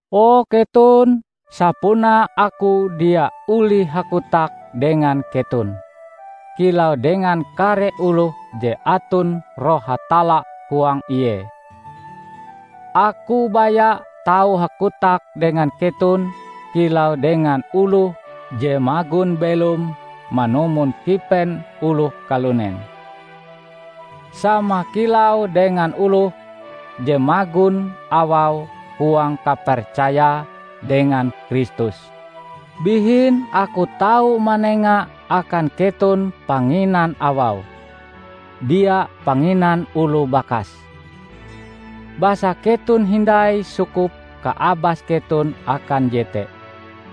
O keton, sapunae aku dia olih hakotak dengan keton kilau dengan kare oloh je aton Roh Hatalla huang ie. Aku baya tau hakotak dengan keton kilau dengan oloh je magon belom manumon kipen oloh kalunen; sama kilau dengan oloh je magon awau huang kapercayae dengan Kristus. Bihin aku tau manenga akan keton panginan awau, dia panginan oloh bakas; basa keton hindai sukup kaabas keton akan jete.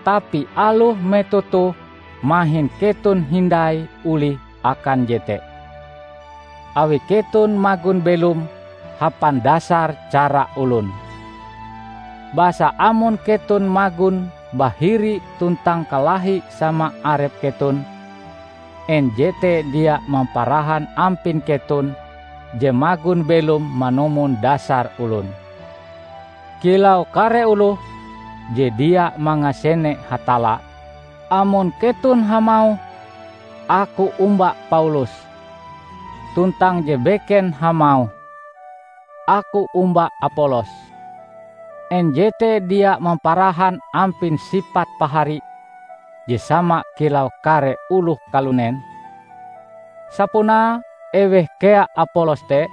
Tapi aloh metoh toh mahin keton hindai olih akan jete, awi keton magon belom hapan dasar cara olon. Basa amon keton magon bahiri tuntang kalahi sama arep keton, en jete dia mamparahan ampin keton je magon belom manumon dasar olon, kilau kare oloh je dia mangasene Hatalla? Amon keton hamauh, "Aku omba Paulus," tuntang je beken hamauh, "Aku omba Apolos," en jete dia mamparahan ampin sipat pahari je sama kilau kare oloh kalunen? Sapunae eweh kea Apolos te?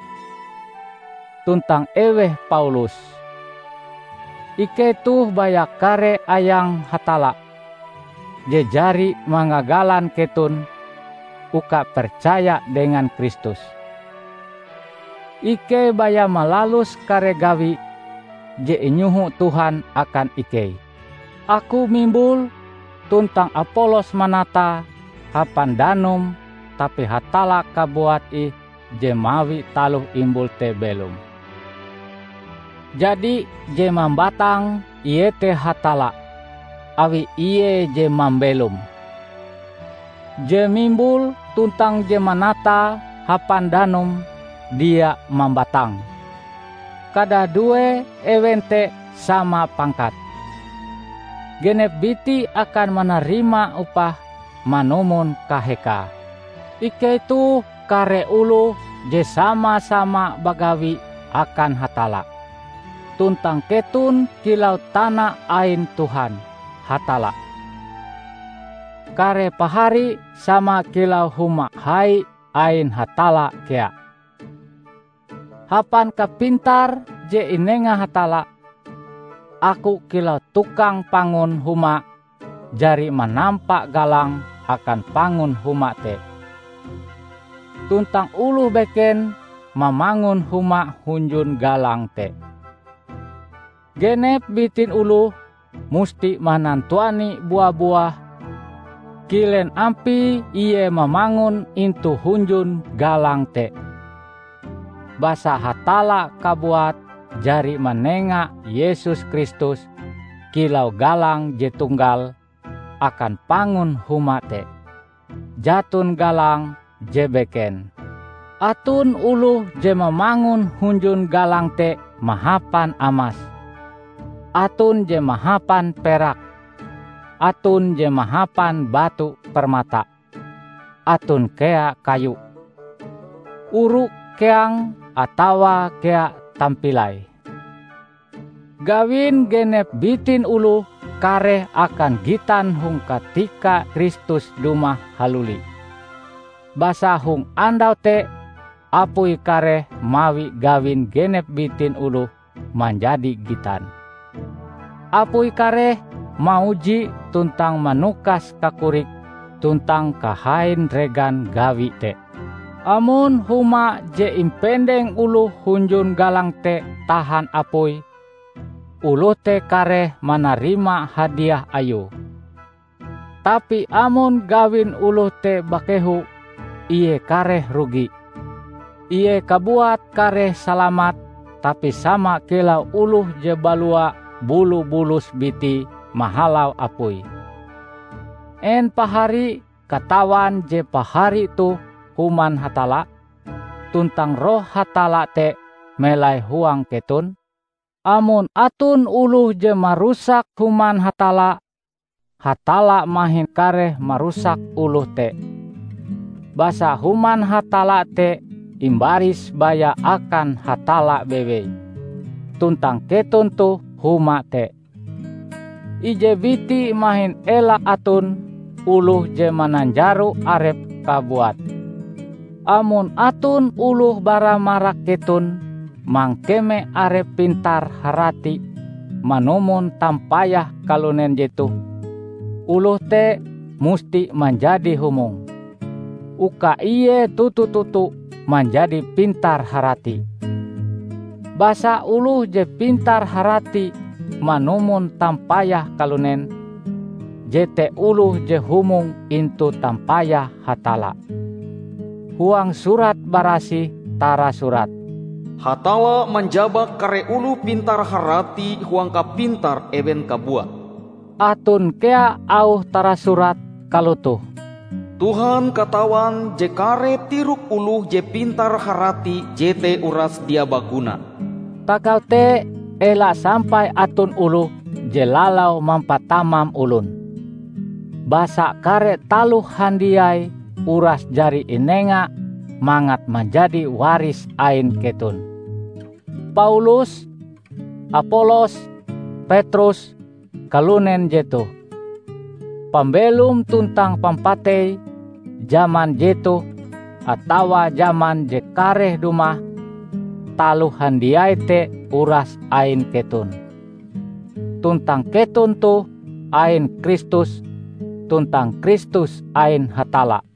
Tuntang eweh Paulus? Ikei toh baya kare ayang Hatalla, je jari mangagalan keton uka percaya dengan Kristus. Ikei baya malalus kare gawi je inyoho Tuhan akan ikei. Aku mimbule tuntang Apolos manatae hapan danum tapi Hatalla kabuat ih je mawi taloh imbul te belom. Jadi je mambatang iete Hatalla, awi Ie je mambelome. Je mimbul tuntang je manatae hapan danum dia mambatang; kadadue ewen te sama pangkate. Genep biti akan manarima upah manumon kahekae. Ikei toh kare oloh je sama-sama bagawi akan Hatalla; tuntang keton kilau tana ain Tuhan, Hatalla. Kare pahari sama kilau huma hai ain Hatalla kea. Hapan kapintar je inenga Hatalla, aku kilau tukang pangun huma jari manampa galang akan pangun huma te, tuntang oloh beken mamangun huma hunjun galang te. Genep bitin oloh musti manantuani bua-buah kilen ampie ie mamangun intu hunjun galang te. Basa Hatalla kabuat jari manenga Yesus Kristus kilau galang je tunggal akan pangun huma te; jaton galang je beken. Aton oloh je mamangun hunjun galang te mahapan amas, aton je mahapan perak, aton je mahapan batu permata, aton kea kayu, oru keang atawa kea tampilai. Gawin genep bitin oloh kareh akan gitan hong katika Kristus dumah haluli. Basa hong andau te apui kareh mawi gawin genep bitin oloh manjadi gitan. Apui kareh mauji tuntang manukas kakorik tuntang kahain regan gawi te. Amon huma je impendeng oloh hunjun galang te tahan apui, oloh te kareh manarima hadiah ayue. Tapi amon gawin oloh te bakeho, ie kareh rugi; ie kabuat kareh salamat tapi sama kilau oloh je balua bulu-bulus bitie mahalau apui. En pahari katawan je pahari toh Human Hatalla? Tuntang Roh Hatalla te melai huang keton? Amon aton oloh je marusak Human Hatalla, Hatalla mahin kareh marusak oloh te. Basa Human Hatalla te imbaris baya akan Hatalla bewei, tuntang keton toh huma te. Ije biti mahin ela aton oloh je mananjaro arepe kabuat. Amon aton oloh bara marak keton mangkeme arepe pintar-harati manumon tampayah kalunen jetoh, oloh te musti manjadi humong, uka ie toto-toto manjadi pintar-harati. Basa oloh je pintar-harati manumon tampayah kalunen, jete oloh je humong intu tampayah Hatalla. Huang Surat Barasih tarasurat, "Hatalla manjabak kare oloh pintar-harati huang kapintar ewen kabuat." Aton kea auh tarasurat kalotoh, "Tuhan katawan je kare tirok oloh je pintar-harati jete uras dia baguna." Tagal te, ela sampai aton oloh je lalau mampatamam olon, basa kare taloh handiai uras jari inenga mangat manjadi waris ain keton: Paulus, Apolos, Petrus, kalunen jetoh, pambelom tuntang pampatei, jaman jetoh atawa jaman je kareh dumah, taloh handiai te uras ain keton. Tuntang keton toh ain Kristus, tuntang Kristus ain Hatalla.